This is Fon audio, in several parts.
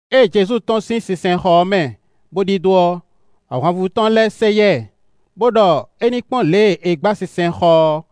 Ée Jezu tɔ́n sín sinsɛnxɔ ɔ́ mɛ bó ɖidó ɔ́, ahwanvú tɔn lɛ́ɛ sɛ yá ɛ, bó ɖɔ é ní kpɔ́n lě e è gbǎ sinsɛnxɔ ɔ́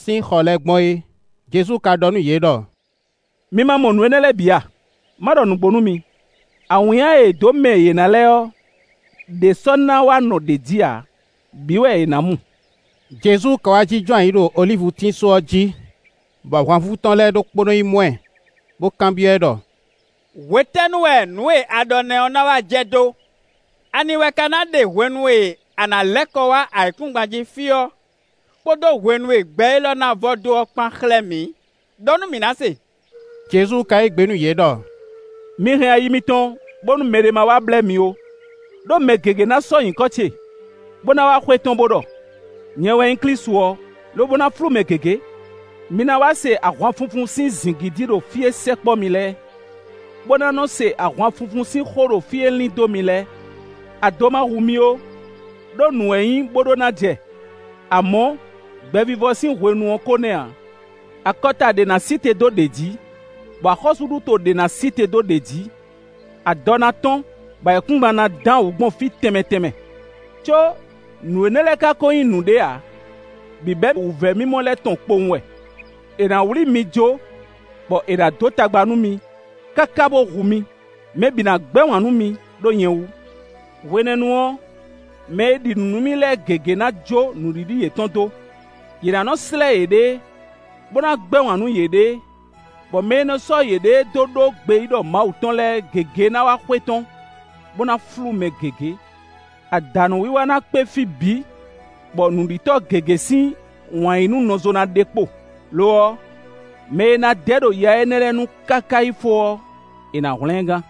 sín xɔ lɛ́ɛ gbɔn é. Jezu ka ɖɔ nú yě ɖɔ: “Mi ma mɔ nǔ énɛ́ lɛ́ɛ bǐ a? Má ɖɔ nǔgbó nú mi: awǐnnya e è dǒ mɛ yě ná lɛ́ɛ ɔ́, ɖě sɔ́ ná wá nɔ ɖě jí ǎ; bǐ wɛ è nǎ mu.” Jezu ka wá jínjɔ́n ayǐ ɖo olívutín só ɔ́ jí, bɔ ahwanvú tɔn lɛ́ɛ ɖokpónɔ yi mɔ ɛ, bó kanbyɔ́ ɛ ɖɔ: “Hwetɛ́nu wɛ nǔ e a ɖɔ nɛ́ ɔ́ ná wá jɛ dó? Ani wɛ ka ná ɖe hwenu e a nǎ lɛ́ kɔ wá ayǐkúngban jí fí ɔ́, kpódó hwenu e gbɛ élɔ́ ná vɔ dó ɔ́ kpán xlɛ́ mǐ? Ɖɔ nú mǐ ná se.” Jezu ka yí gbe nú yě ɖɔ: “Mi hɛn ayi mitɔn, bónú mɛɖé má wá blɛ́ mi ó, ɖó mɛ gěgé ná sɔ́ nyǐkɔ ce, bó ná wá xwetɔ́n, bó ɖɔ: ‘Nyɛ wɛ nyí Klísu ɔ́;’ lobo ná flú mɛ gěgé. Mi ná wá se ahwanfunfun sín zǐngídi ɖo fí e sɛkpɔ́ mi lɛ́ɛ, bó ná nɔ́ se ahwanfunfun sín xó ɖo fí e lín dó mi lɛ́ɛ. Ado ma hu mi ó; ɖó nǔ wɛ nyí bó ɖó ná jɛ; amɔ̌, gbɛvivɔ sín hwenu ɔ́ ko nɛ́ ǎ. Akɔta ɖě ná sí te dó ɖě jí, bɔ axɔ́súɖuto ɖě ná sí te dó ɖě jí; adɔ ná tɔ́n, bɔ ayǐkúngban ná dǎn wǔ gbɔn fí tɛnmɛ tɛnmɛ. Có, nǔ énɛ́ lɛ́ɛ ka ko nyí nǔɖé ǎ; bǐbɛ́ wǔvɛ́mimɔ lɛ́ɛ tɔn kpowun wɛ. “È nǎ wlí mi jó, bɔ è nǎ dó tagba nú mi, káká bó hu mi. Mɛ bǐ ná gbɛ́ wǎn nú mi, ɖó nyɛ wú. Hwenɛ́nu ɔ́, mɛ e ɖi nǔ nú mì lɛ́ɛ gěgé ná jó nǔɖiɖi yětɔn dó. Yě ná nɔ́ slɛ́ yěɖée, bó ná gbɛ́ wǎn nú yěɖée, bɔ mɛ e nɔ sɔ́ yěɖée dó ɖó gbeyíɖɔ Mawu tɔn lɛ́ɛ gěgé ná wá xwetɔ́n, bó ná flú mɛ gěgé. Adǎnúwiwa ná kpé fí bǐ bɔ nǔɖitɔ́ gěgé sín wǎn yí nú nɔzo ná ɖe kpo. Lo ɔ́, mɛ e ná dɛ ɖo ya énɛ́ lɛ́ɛ nu káká yi fó ɔ́, è nǎ hwlɛ́n ɛ gán.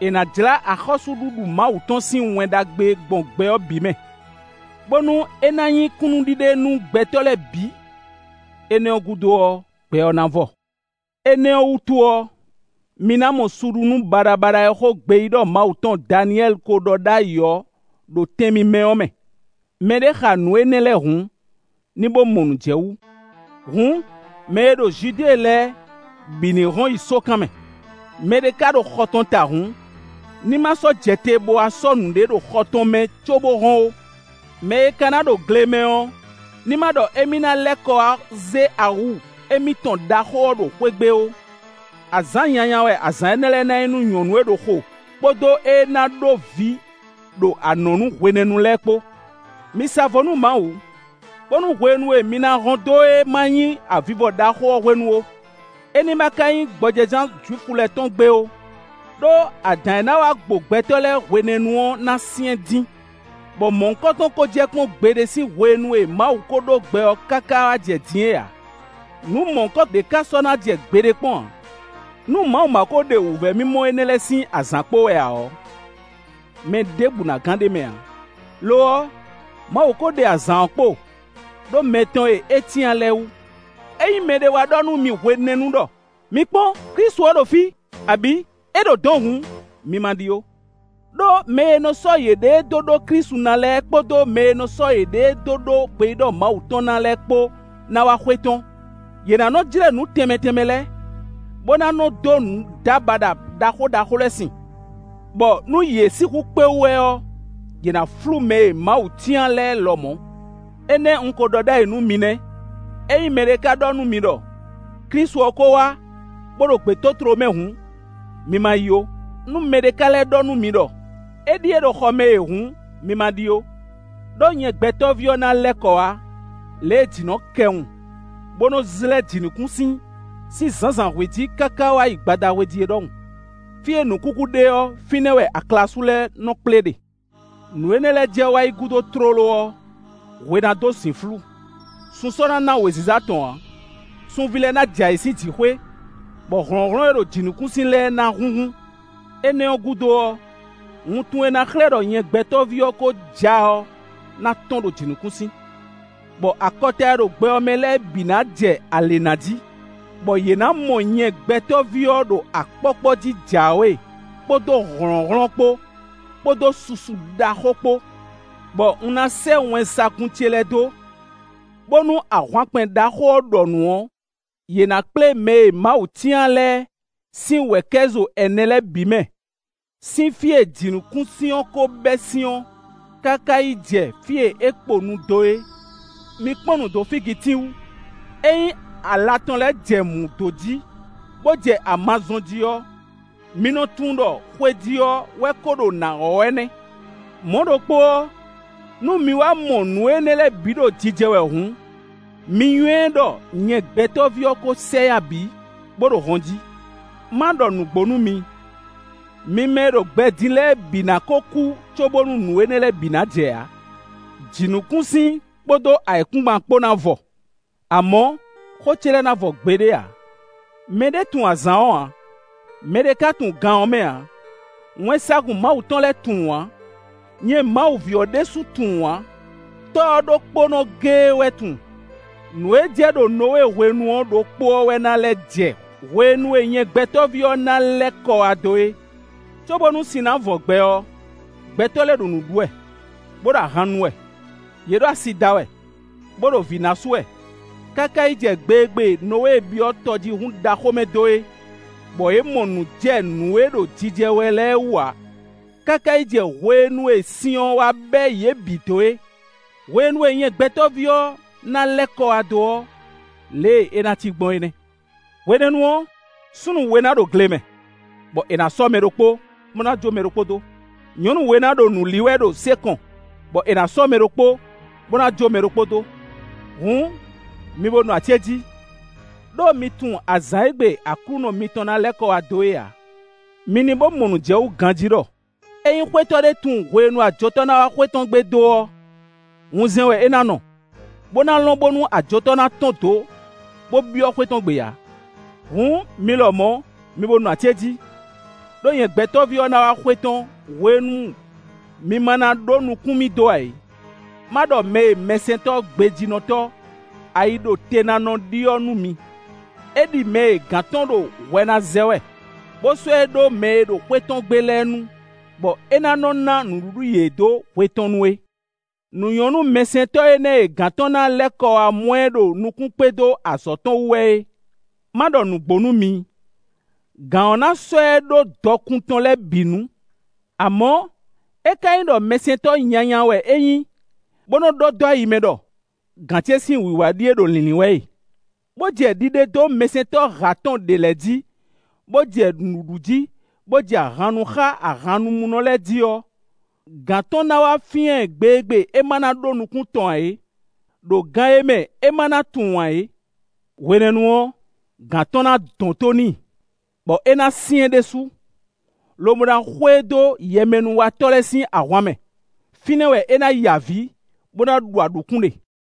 È nǎ jlá axɔ́súɖuɖu Mawu tɔn sín Wɛn Ɖagbe gbɔn gbɛ ɔ́ bǐ mɛ, bónú é ná nyí kúnnuɖiɖe nú gbɛtɔ́ lɛ́ɛ bǐ. Énɛ́ ɔ́ gúdo ɔ́, gbɛ ɔ́ ná vɔ. “Énɛ́ ɔ́ wútu ɔ́, mi ná mɔ suɖunú baɖabaɖa e xó gbeyíɖɔ Mawu tɔn Daniyɛ́li ko ɖɔ ɖ'ayǐ ɔ́ ɖo tɛn mímɛ́ ɔ́ mɛ. Mɛ ɖé xa nǔ énɛ́ lɛ́ɛ hǔn, ní bó mɔ nǔ jɛ wú. Hǔn, mɛ e ɖo Judée lɛ́ɛ bǐ ní hɔn yi sókan mɛ. Mɛ ɖé ka ɖo xɔ tɔn ta hǔn, ní ma sɔ́ jɛ te bo wá sɔ́ nǔɖé ɖo xɔ tɔn mɛ cóbó hɔn ó. Mɛ e ka ná ɖo gle mɛ ɔ́ ní ma ɖɔ émí ná lɛ́ kɔ wá zé awu émítɔn ɖaxó ɔ́ ɖo xwé gbe ó. Azǎn nyanya wɛ azǎn énɛ́ lɛ́ɛ ná nyí nú nyɔ̌nu e ná ɖo xo, kpódó éé ná ɖó vǐ ɖo anɔ̌nu hwenɛ́nu lɛ́ɛ kpó. Mi sa vo nú Mawu, bónú hwenu e mi ná hɔn dó é ma nyí avivɔ ɖaxó ɔ́ hwenu ó; é ní ma ka nyí gbɔjɛzán Jwifu lɛ́ɛ tɔn gbe ó; ɖó adǎn e na wá gbo gbɛtɔ́ lɛ́ɛ hwenɛ́nu ɔ́ na syɛ́n dín, bɔ mɔ̌hunkɔtɔn ko jɛ kpɔ́n gbeɖé sín hwenu e Mawu ko ɖó gbɛ ɔ́ káká wá jɛ din é ǎ; nǔ mɔ̌hunkɔ ɖě ká sɔ́ ná jɛ gbeɖé kpɔ́n ǎ. Nú Mawu ma ko ɖe wǔvɛ́ mimɔ énɛ́ lɛ́ɛ sín azǎn kpo wɛ ǎ ɔ́, mɛ ɖěbǔ na gán ɖ'é mɛ ǎ. Lo ɔ́, Mawu ko ɖe azǎn ɔ́ kpo ɖó mɛ tɔn e é cyán lɛ́ɛ wú. “Ényí mɛɖé wá ɖɔ nú mi hwenɛ́nu ɖɔ: ‘Mi kpɔ́n! Klísu ɔ́ ɖo fí;’ abǐ ‘É ɖo dɔ̌n hǔn, mi ma ɖi ó’; ɖó mɛ e nɔ sɔ́ yěɖée dó ɖó Klísu ná lɛ́ɛ kpódó mɛ e nɔ sɔ́ yěɖée dó ɖó gbeyíɖɔ Mawu tɔn ná lɛ́ɛ kpó ná wá xwetɔ́n. Yě ná nɔ́ jlɛ́ nǔ tɛnmɛ tɛnmɛ lɛ́ɛ, bó ná nɔ́ dó nǔdábaɖa ɖaxó ɖaxó lɛ́ɛ sin, bɔ nú yě sixú kpé wú wɛ ɔ́, yě ná flú mɛ e Mawu cyán lɛ́ɛ lɔmɔ̌. Énɛ́ un ko ɖɔ ɖ'ayǐ nú mi nɛ́. “Ényí mɛɖé ka ɖɔ nú mi ɖɔ: ‘Klísu ɔ́ ko wá, bo ɖo gbětótló mɛ’ hǔn, mi ma yi ó. Nú mɛɖé ka lɛ́ ɖɔ nú mi ɖɔ: ‘Éɖíe ɖo xɔ mɛ e’ hǔn, mi ma ɖi ó. Ɖó nyɛ Gbɛtɔ́ví ɔ́ ná lɛ́ kɔ wá lě e jǐ nɔ kɛwun, bó nɔ́ zlɛ́ jǐnukúnsin sín zǎnzǎnhwe jí káká wá yi gbadahwe jí é ɖɔhun. Fí e nǔkúkú ɖe ɔ́, fínɛ́ wɛ aklasú lɛ́ɛ nɔ kplé ɖe. “Nǔ énɛ́ lɛ́ɛ jɛ wá yi gúdo tlóló ɔ́, hwe ná dó zǐnflú, sun sɔ́ ná ná wěziza tɔn ǎ; sunví lɛ́ɛ ná jɛ ayǐ sín jǐxwé, bɔ hlɔ̌nhlɔ́n e ɖo jǐnukúnsin lɛ́ɛ ná húnhún. Énɛ́ ɔ́ gúdo ɔ́, wuntun e ná xlɛ́ ɖɔ nyɛ Gbɛtɔ́ví ɔ́ ko ja ɔ́ ná tɔ́n ɖo jǐnukúnsin, bɔ akɔta e ɖo gbɛ ɔ́ mɛ lɛ́ɛ bǐ ná jɛ alě ná jí, bɔ yě ná mɔ nyɛ Gbɛtɔ́ví ɔ́ ɖo akpɔ́kpɔ́ jí jǎwe kpódó hlɔ̌nhlɔ́n kpó, kpódó susu ɖaxó kpó; bɔ un ná sɛ́ wɛnsagun ce lɛ́ɛ dó, bónú ahwankpɛn ɖaxó ɔ́ ɖɔ nǔ ɔ́, yě ná kplé mɛ e Mawu cyán lɛ́ɛ sín wɛ̌kɛ́zo ɛnɛ lɛ́ɛ bǐ mɛ, sín fí e jǐnukúnsin ɔ́ ko bɛ́ sín ɔ́, káká yi jɛ fí e é kponu dó ɔ́. “Mi kpɔ́n nǔ dó fígitín wú: ényí ala tɔn lɛ́ɛ jɛ mǔ dó jí, bó jɛ ama zɔ́n jí ɔ́, mi nɔ tunwun ɖɔ xwejí ɔ́ wɛ ko ɖo nǎ wɔ̌ wɛ nɛ́. Mɔ̌ ɖokpó ɔ́, nú mi wá mɔ nǔ énɛ́ lɛ́ɛ bǐ ɖo jijɛ wɛ hǔn, mi nywɛ́ ɖɔ nyɛ Gbɛtɔ́ví ɔ́ ko sɛ yá bǐ, bó ɖo hɔn jí. Má ɖɔ nǔgbó nú mi: mi mɛ e ɖo gbɛ din lɛ́ɛ bǐ ná ko kú cóbónú nǔ énɛ́ lɛ́ɛ bǐ ná jɛ ǎ. Jǐnukúnsin kpódó ayǐkúngban kpó ná vɔ, amɔ̌, xó ce lɛ́ɛ ná vɔ gbeɖé ǎ. “Mɛ ɖé tunwun azǎn ɔ́ ǎ; mɛɖé ka tunwun gan ɔ́ mɛ ǎ; wɛnsagun Mawu tɔn lɛ́ɛ tunwun ǎ; nyɛ Mawu ví ɔ́ ɖésú tunwun ǎ; Tɔ́ ɔ́ ɖokpónɔ géé wɛ tunwun. Nǔ e jɛ ɖo Nɔwée hwenu ɔ́ ɖokpó ɔ́ wɛ ná lɛ́ jɛ hwenu e nyɛ Gbɛtɔ́ví ɔ́ ná lɛ́ kɔ wá dó é. Cóbónú sin ná vɔ gbɛ ɔ́, gbɛtɔ́ lɛ́ɛ ɖo nǔ ɖu wɛ, bó ɖo ahan nu wɛ. Yě ɖo asi da wɛ, bó ɖo vǐ ná asú wɛ, káká yi jɛ gbe e gbe Nɔwée byɔ́ tɔjíhún ɖaxó mɛ dó é, bɔ yě mɔ nǔ jɛ nǔ e ɖo jijɛ wɛ lɛ́ɛ wú ǎ, káká yi jɛ hwenu e sin wá bɛ́ yě bǐ dó é. Hwenu nyɛ Gbɛtɔ́ví ɔ́ ná lɛ́ kɔ wá dó ɔ́, lě e é ná cí gbɔn é nɛ́. Hwenɛ́nu ɔ́, súnnu we ná ɖo gle mɛ, bɔ è nǎ sɔ́ mɛ ɖokpó, bó ná jó mɛ ɖokpó dó. Nyɔ̌nu we ná ɖo nǔ li wɛ ɖo sé kɔn, bɔ è nǎ sɔ́ mɛ ɖokpó, bó ná jó mɛ ɖokpó dó. Hǔn mi bo nɔ acéjí, ɖó mi tunwun azǎn e gbe Aklúnɔ mitɔn ná lɛ́ kɔ wá dó é ǎ. Mi ní mɔ nǔ jɛ wú ganjí ɖɔ: ényí xwétɔ́ ɖé tunwun hwenu e ajotɔ́ ná wá xwé tɔn gbe dó ɔ́, wunzɛn wɛ é ná nɔ, bó ná lɔn bónú ajotɔ́ ná tɔ́n dǒ, bó byɔ́ xwé tɔn gbe ǎ. Hǔn mi lɔmɔ̌, mi bo nɔ acéjí, ɖó nyɛ Gbɛtɔ́ví ɔ́ ná wá xwetɔ́n hwenu e mi ma ná ɖó nukún mì dó ǎ é. “Má ɖɔ mɛ e mɛsɛntɔ́ gbejínɔtɔ́, ayiɖotenánɔ ɖi ɔ́ nú mi: é ɖi mɛ e gǎn tɔn ɖo hwɛ ná zɛ wɛ, bó sɔ́ ɛ ɖó mɛ e ɖo xwé tɔn gbe lɛ́ɛ nu, bɔ é ná nɔ ná nǔɖuɖu yě dó hwe tɔn nu é. Nǔ nyɔ́ nú mɛsɛntɔ́ énɛ́ e gǎn tɔn ná lɛ́ kɔ wá mɔ ɛ ɖo nukún kpé dó azɔ̌ tɔn wú wɛ é. Má ɖɔ nǔgbó nú mi: gǎn ɔ́ ná sɔ́ ɛ ɖó dɔkun tɔn lɛ́ɛ bǐ nu. Amɔ̌, é ka nyí ɖɔ mɛsɛntɔ́ nyanya wɛ é nyí, bó nɔ́ ɖɔ dó ayi mɛ ɖɔ: ‘Gǎn ce sín wǐwá ɖíe ɖo lǐnlín wɛ e,’ bó jɛ ɖiɖe dó mɛsɛntɔ́ hǎ tɔn ɖě lɛ́ɛ jí, bó jɛ nǔ ɖu jí, bó jɛ ahan nu xá ahannumúnɔ lɛ́ɛ jí ɔ́, gǎn tɔn ná wá fyán ɛ gbe e gbe é má ná ɖó nukún tɔn ǎ é, ɖo gan e mɛ é má ná tunwun ǎ é. Hwenɛ́nu ɔ́, gǎn tɔn ná dɔn tó n'i, bɔ é ná syɛ́n ɖésú, lobo ná xwe e dó yɛmɛnúwatɔ́ lɛ́ɛ sín ahwan mɛ; fínɛ́ wɛ é ná ya avǐ, bó ná ɖu aɖǔkún ɖe.